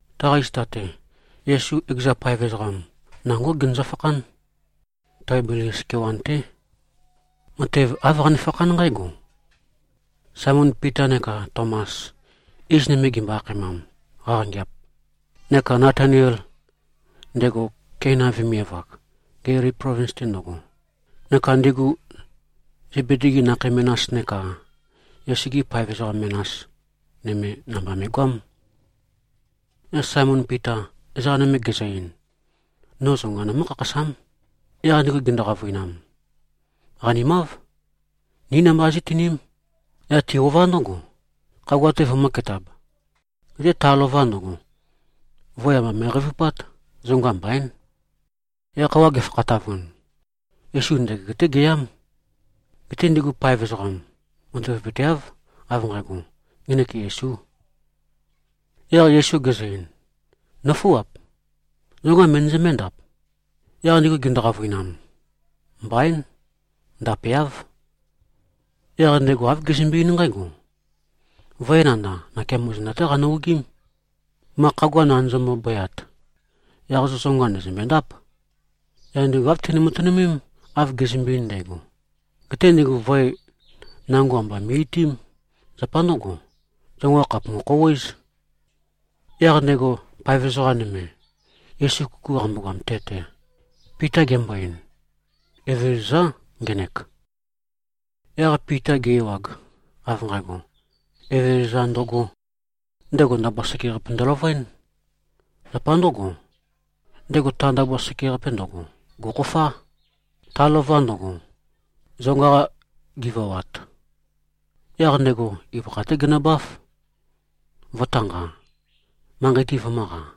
Taqa zita-te, Yesu ekeza paev ezoqam nangó genøzø-fakhán. Taibelias kewan-té. Matev āv qanefakhán nqǽgo: Saemon Pita neka Tomas, iz nøme gimbo-akhaemam Qaqangeap, neka Natanael, ndego Keina vemiav-ak, Gelili plovins-te ndøgo, neka ndigu Zebedi-gi nakhei menas neka Yesu-gi paev ezoqa menas nøme, namba me꞉goám. Yaq Saemon Pita, ezoqa nøme gezø-ein, “No zonga nømǿ-khakhasám.” Yaq ndigu gindu-qavøinam, “Qanimáv. Ni namba zí꞉tiním.” Yaq ti-ová ndǿgo, khagua-te vømø̄ketab. Geté ta lova ndøgo, voe amba me꞉qeivupát. Zonga mbaín. Yaq khøuwa gefakhatavun, Yesu ndøgeg-té geyám. Geté ndigu paev ezoqam matavapøteáv, av nqægo, ngenek Yesū. Yaq Yesu gezø-ein, “Nǿfuap. Zonga møndøzømbé-ndap?” Yaq ndigu gindu-qavøinam, “Mbaín. Ndapeáv.” Yaq ndego āv gezømbe-eín nqǽgo, “Voe nandav, nakeamo zenda-té qanø-ogím, ma khagua nandøzømbe-bøyat. Yaq zo zonga ndø̀zømbendáp.” Yaq ndigu āv tini-matønømém, av gezømbe-ein ndægo. Geté ndigu voe nango amba me꞉-itiím. Zapa ndǿgo, zonga khàpumu-khouwéz. Yaq ndego paev ezoqa nøme, Yesu kuku qambogoam te-te, Pita gembo-ein, “Evezøzá, ngenek.” Yaq Pita ge-ewag, av nqægo, Evezøza ndøgō, ndego ndabua sekeqape ndøløvøén. Zapa ndǿgo, ndego ta ndabua sekeqape ndøgo, gò꞉khofá, ta lova ndøgo, zonga-qa givawat. Yaq ndego ibøkha-té genøbáf, vø̄tanqa, manqei-te vømø̄qa.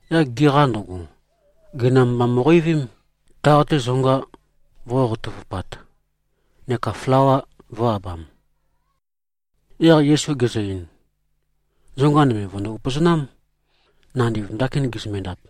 Yaq giqa ndøgo, gøinam mba mo꞉qeivím, taq-te zonga vō꞉qoqoutøvupat neka flawa vø̄-abam. Yaq Yesu gezø-ein, “Zonga nøme vø̀ndo-upøzonám, nandiv ndakin gizømbe-ndap.”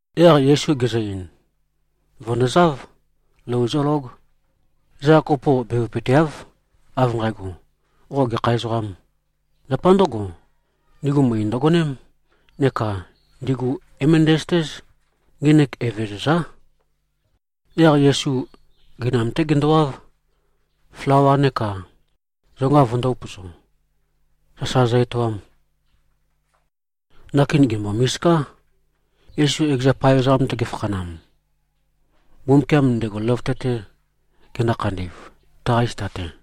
Yaq Yesu gezø-ein, “Vø̀ndozáv. Lou zólóg.” Ezoqa kopo bevøpøteáv, av nqægo, “Qo gekha ezoqâm?” Zapa ndǿgo, ndigu møe ndøgoném, neka ndigu é-møndæzøtéz, ngenek Evezøzá. Yaq Yesu gøinam-té gendowáv, flawa neka zonga vøndō-upøzo, sasa zø-etoam. Ndakin gèmbo-misiká, Yesu ekeza paev ezoqam-te gefakhanam, Mbumbukiam ndego løvøte-te gendo-khandi꞉v, taqa zita-te.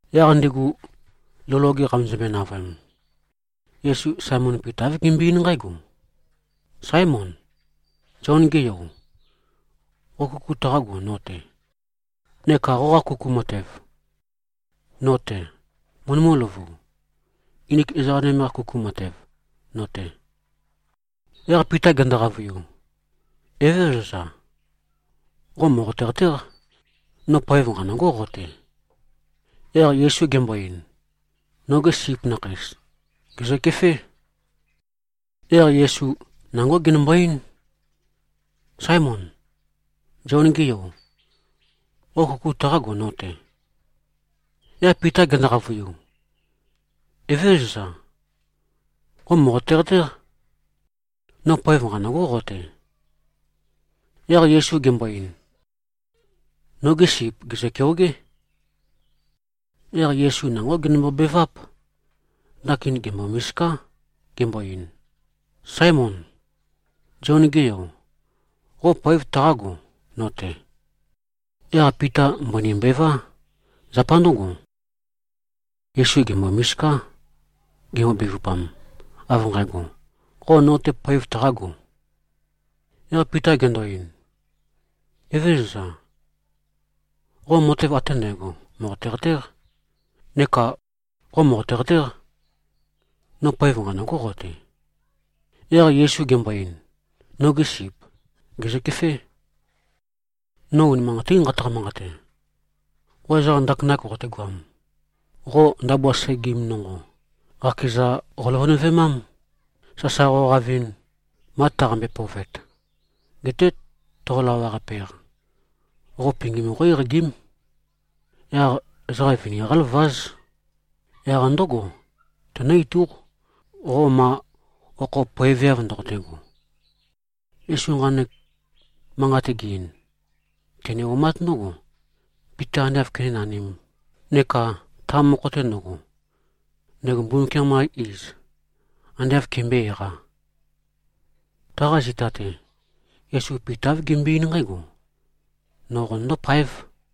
Yaq ndigu lou loge qamezømbe-navøem, Yesu Saemon Pita āv gembøe-eín nqǽgo, “Sáemon, Zion-ge yo, qo kuku taqágo, no-te? Neka qoqa kuku matev no-te møndømǿ-løvu, nginik ezoqa nøme-qa kuku matev no-te?” Yaq Pita gendo-qavøiu, “Evézøza. Qo mòqote-qatéq, no poev nqanø̂gó qo-te.” Yaq Yesu gembo-ein, “Nogi sip nakheis, gè꞉zøkefé.” Yaq Yesu nangó genømbo-eín, “Sáemon, Zion-ge yo, qo kuku taqágo, no-te?” Yaq Pita gendo-qavøiu, “Evézøza. Qo mòqote-qatéq, no poev nqanø̂gó qo-te.” Yaq Yesu gembo-ein, “Nogi sip, gèzø-keogé.” Yaq Yesu nangó genømbo-beváp. Ndakin gèmbo-misiká, gembo-ein, “Sáemon, Zion-ge yo, qo poev taqágo, no-te?” Yaq Pita mbøni mbová. Zapa ndǿgo, Yesu gèmbo-misiká, gembo-bevupam, av nqægo, “Qo no-te poev taqāgo?” Yaq Pita gendo-ein, “Evézøza, qo matev ate ndægo mòqote-qatéq. Neka qo mòqote-qatéq, no poev nqanø̂gō qo-te.” Yaq Yesu gembo-ein, “Nogi sip gè꞉zøkefé. No unimanqatín nqataqa-manqate. Qo ezoqam ndakinak qoqotegoam, qo ndabua segim nonqo qakeza qoløvønøvemám, sasa qoqavɨn, ma taqambe-pøovet. Geté toqo-lawaqape-eq, qo pingim qó-eqagím. Yaq ezoqa vini qáløváz. Yaq ndǿgo tenǿ-itúq, qo ma okho poeveav ndoqotego.” Yesu nqanek manqat ge-ein, tene-omát ndǿgo, Pita ande āv kenénanīm neka ta mokho-te ndøgo, ndego Mbumbukiam-qa iz ande āv kembøé-eqā. Taqa zita-te, Yesu Pita āv gembøe-eín nqǽgo, “No qonøndó-páev.”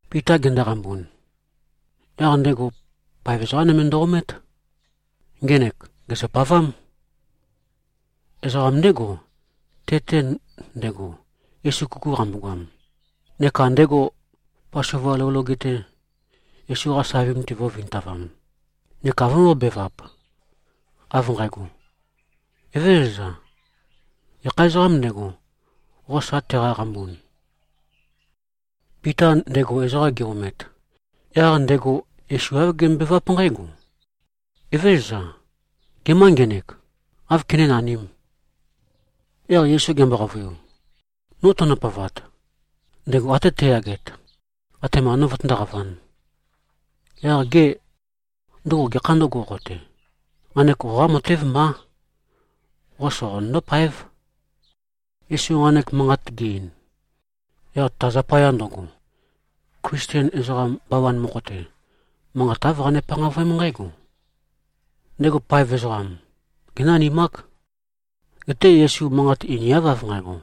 Pita gendoqambun, yaq ndego paev ezoqa nøme ndø-omét. Ngenek gèzøpavám. Ezoqa ndégo, te-te ndego, Yesu kuku qambogoam, neka ndego Pasova lou loge-te, Yesu-qa savim-te go꞉vintavam, neka vømbōbevap, av nqægo, “Evézøza, gekha ezoqâm ndego, qo sa teqaqambun?” Pita ndego ezoqam ge-omet, yaq ndego Yesu āv gembøebeváp nqǽgo, “Evézøza, gemâ ngenek? Áv kenénanīm?” Yaq Yesu gembo-qavøiu, “No tønø-pøovat, ndego até teyaget, atema no vøtøndóqavān, yaq gê, ndøgo gekhā ndǿgo, qo-te? Nqanek qoqá matév mbá. Qo soqonøndó-páev.” Yesu nqanek manqat ge-ein, yaq ta zapaya ndøgo, Klisten ezoqa bawan mokho-te, manqat āv qane-panqavøém nqǽgo: Ndego paev ezoqam génanimák. Geté Yesu manqat einiáv av nqægo,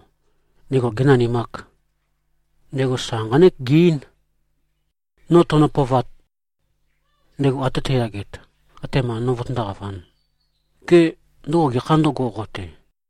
ndego gēnanimāk. Ndego sa nqánek ge-eín, “No tønø-pøovat, ndego ate teyaget, atema no vøtøndóqavān, gê, ndøgo gekhā ndǿgo, qo-te?”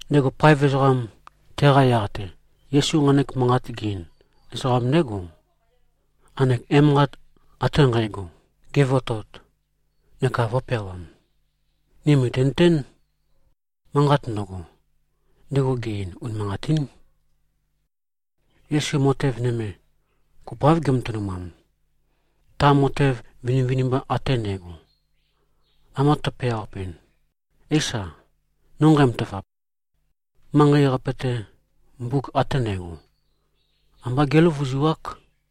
Ndego paev ezoqam, teqa yaq-te Yesu nqanek manqat ge-ein, ezoqam ndégo, nqanek emanqat ate nqægo gevotot neka vø̄peawam. Ni mø̀tinøtén, manqat ndøgo, ndego ge-ein, unimanqatín. Yesu matev nøme kopoáv gematønumam. Ta matev vinivinimba ate ndægo, amba tøpeawapɨn, éisa, no nqæmatavap, manqei-qape-te, mbuk ate ndægo, ambá géløvuzuák.